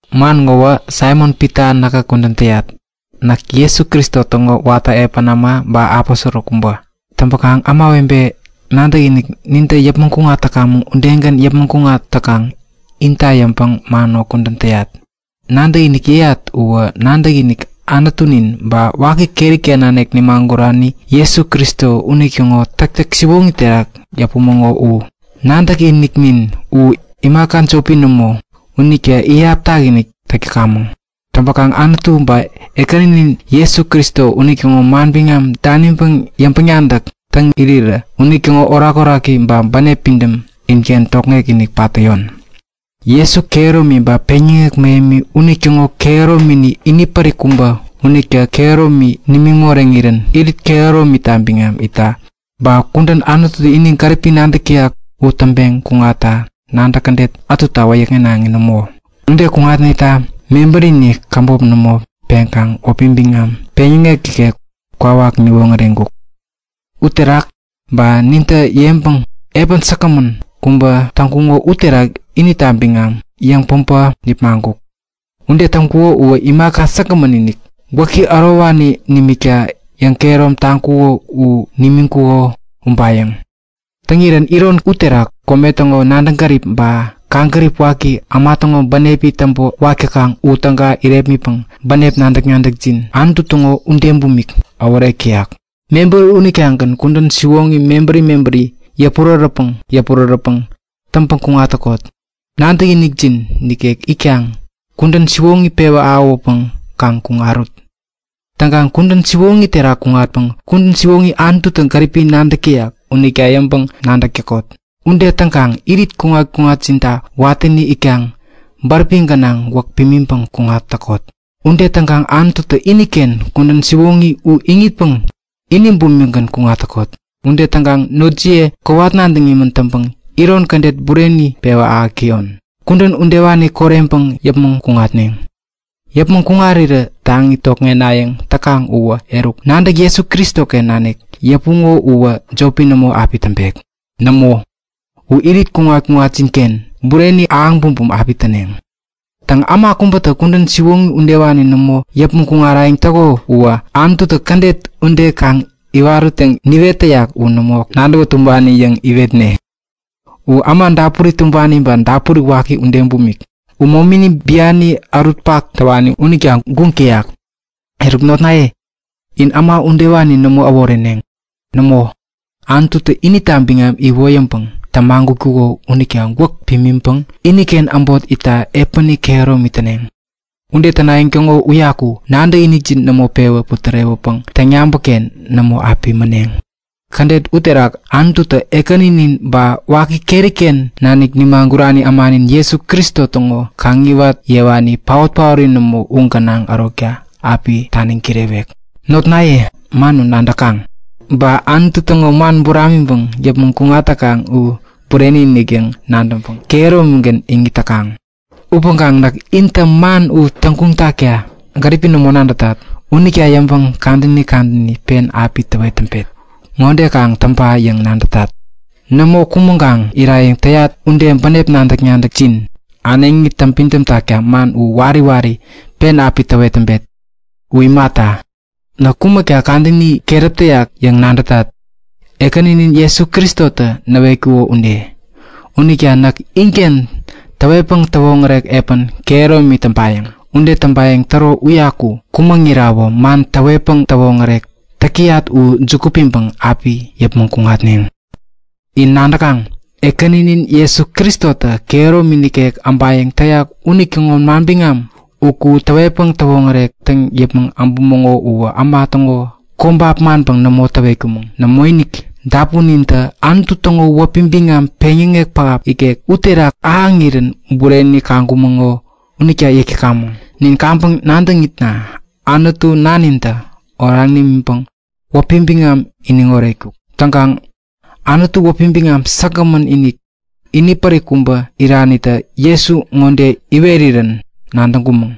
Man ŋowä Saimon-Pita näkä kudän täyat. Näk Jesu Kristo täŋo watä epän äma ba aposoro kubä. Täŋkaŋ ämawebe nadäkinik nintä yäpmäŋ kuŋat täkamäŋ udegän yäpmäŋ kuŋat täkaŋ inta yäŋpäŋ man ŋo kudän täyat. Nadäkinik yäyat uwä nadäkinik Anutunin ba waki keri-ken nanik nimagurani Jesu Kristo unitäŋo täktäk siwoŋi terak yäpumäŋo u. Nadäkiniknin u imaka jopi nämo, unita iyap takinik täk täkamäŋ. Täŋpäkaŋ Anutu ba Ekäninin Jesu Kristo unitäŋo manbiŋam daniŋpäŋ yäŋpäŋ-nadäk täŋ irirä unitäŋo orakoraki ba bänep pidämtä inken tokŋek-inik pat tamik täyon. Jesu Anutu ude itkaŋ kehäromini inipärik kubä unitä kehäromi nimiŋ moreŋirän irit kehäromita biŋam itta, ba kudän Anututä ini gäripi nadäk täyak u täŋpeŋ kuŋatta nadäk kädet ätuta wäyäkŋenaŋi nämo. Ude kuŋatneta mebärini käbop nämo peŋkaŋ wäpi biŋam peŋyäŋek ikek kwawak niwoŋäreŋkuk. Uterak, ba ninta yäŋpäŋ epän säkgämän kubä täŋkuko uterak inita biŋam yäŋpäbä nipmaŋkuk. Ude täŋkuko uwä imaka säkgämän-inik, gwäki ärowani nimikta yäŋkehärom taŋkuko u nimiŋkuko ubayäŋ. Täŋirän iron uterak kome täŋo nadäŋ gärip ba kaŋgärip waki äma täŋo bänepi täŋpänwak täkaŋ u täga irepmitpäŋ bänep nadäk-nadäkjin Anutu täŋo ude bumik äworek täyak. Mebäri unitagän kudän siwoŋi mebäri mebäri yäpurärätpäŋ yäpurärätpäŋ täŋpäŋ kuŋat täkot. Nadäkinikjin nikek itkaŋ kudän siwoŋi pewä ahäwäpäŋ kaŋ kuŋarut. Täŋkaŋ kudän siwoŋi terak kuŋatpäŋ kudän siwoŋi Anututä gäripi nadäk täyak unita yäŋpäŋ-nadäk täk täkot. Ude täŋkaŋ irit kuŋat-kuŋatjinta watäni itkaŋ bäräpi gänaŋ gwäk pimiŋpäŋ kuŋat täkot. Ude täŋkaŋ Anututä iniken kudän siwoŋi u iŋitpäŋ ini bumikgän kuŋat täkot. Ude täŋpäŋ notjiye kowat nadäŋ imän täŋpäŋ iron kädet bureni pewä ahäk täyon. Kudän udewani koreŋpäŋ yäpmäŋ kuŋatneŋ. Yäpmäŋ kuŋarirä taŋi tokŋenayäŋ täkaŋ uwä eruk nadäk Jesu Kristoken nanik yäpuŋo uwä jopi nämo api täŋpek. Nämo, u irit kuŋat-kuŋatjinken bureni ahäŋ bumbum api täneŋ. Täŋ, äma kubätä kudän siwoŋi udewani nämo yäpmäŋ kuŋarayäŋ täko uwä Anututä kädet ude kaŋ iwarut yäŋ niwet täyak u nämo nadäwän tumbani yäŋ iwetne. U äma dapuri tumbani ba dapuri waki ude bumik. U momini biani ärutpak täwani unita guŋ täyak. Eruk notnaye, in äma udewani nämo äworeneŋ. Nämo, Anututä inita biŋam iwoyäŋpäŋ tämagutkuko unita gwäk pimiŋpäŋ iniken äbot itta epäni kehäromi täneŋ. Ude tänayäŋ täŋo uyaku nadäkinikjin nämo pewä putärewäpäŋ täŋyabäk-ken nämo api mäneŋ. Kädet ude terak Anututä Ekäninin ba waki keri-ken nanik nimagurani ämanin Jesu Kristo täŋo kaŋiwat yewani paot-paori nämo u gänaŋ ärokta api taniŋ kirewek. Notnaye, man u nadäkaŋ. Ba Anutu täŋo man buramiŋpäŋ yäpmäŋ kuŋat täkaŋ u bureni-inik yäŋ nadäŋpäŋ kehäromigän iŋit täkaŋ. Upäŋkaŋ näk intä man u täŋguŋ takta gäripi nämo nadätat. Unita yäŋpäŋ kadäni kadäni pen api täwet täŋpet. Ŋode kaŋ täŋpa yäŋ nadätat; Nämo kumäŋkaŋ irayäŋ täyat ude bänep nadäk-nadäkjin äneŋi täŋpidäm takta man u wari wari pen api täwet täŋpet. U imata, näkä kumäkta kadäni keräp täyak yäŋ nadätat, Ekäninin Jesu Kristotä näwetkuko ude. Unita näk inken täwetpäŋ täwoŋärek epän kehäromi täŋpayäŋ. Ude täŋpayäŋ täro uyaku kumäŋirawä man täwetpäŋ täwoŋärek täk täyat u juku piŋpäŋ api yäpmäŋ kuŋatneŋ. In nadäkaŋ; Ekäninin Jesu Kristotä kehäromi nikek äbayäŋ täyak unitäŋo manbiŋam uku täwetpäŋ täwoŋärek täŋ yäpmäŋ äbumäŋo uwä äma täŋo kobap manpäŋ nämo täwetkumäŋ. Nämoinik, dapunintä Anutu täŋo wäpi biŋam peŋyäŋek pähap ikek uterak ahäŋirän bureni kaŋkumäŋo unita yäk täkamäŋ. Nin kaŋpäŋ nadäŋitna Anutu Nanintä oraŋ imiŋpäŋ wäpi biŋam iniŋ oretkuk. Täŋkaŋ Anutu wäpi biŋam säkgämän-inik, inipärik kubä iranitä Jesu ŋode iwerirän nadäŋkumäŋ;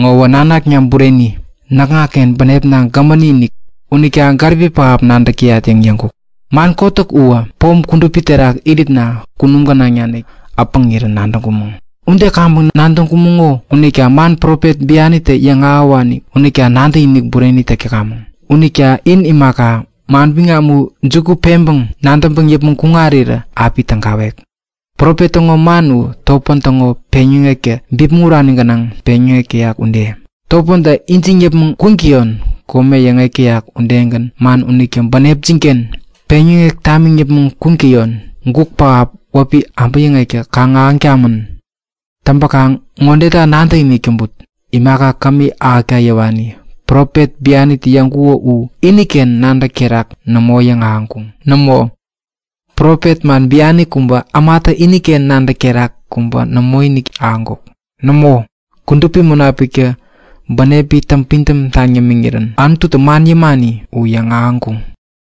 Ŋowä nanakna bureni, näkŋaken bänepna gämäni-inik. Unita gäripi pähap nadäk täyat yäŋ yäŋkuk. Man kotäk uwä, pom kudupi uterak iritna kunum gänaŋ naniktä äpäŋirän nadäŋkumäŋ. Ude kaŋpäŋ nadäŋkumäŋo unita man profet bianitä yäŋahäwani unita nadäkinik bureni täk täkamäŋ. Unita in imaka, manbiŋam u juku peŋpäŋ nadäŋpäŋ yäpmäŋ kuŋarirä api tägawek. Profet täŋo man u topän täŋo peŋyäŋektä bipmäŋ urani gänaŋ peŋyäŋek täyak ude. Topäntä ijiŋ yäpmäŋ kuŋtäyon kome yäŋek täyak udegän man unitä bänepjin-ken peŋyäŋeŋ tamiŋ yäpmäŋ kuŋtäyon guk pähap wäpi abäyäŋektä kaŋ ahäŋ tamän. Täŋpäkaŋ ŋodeta nadäkinik täŋput; Imaka kämi ahäkta yäwani profet bianitä yäŋkuŋo u iniken nadäk terak nämo yäŋahäŋkuŋ. Nämo, profet man biani kubä ämatä iniken nadäk terak kubä nämoinik ahäŋkuk. Nämo, Kudupi Munapiktä bänepi täŋpidäm taŋ yämiŋirän Anututä man yämani u yäŋahäŋkuŋ.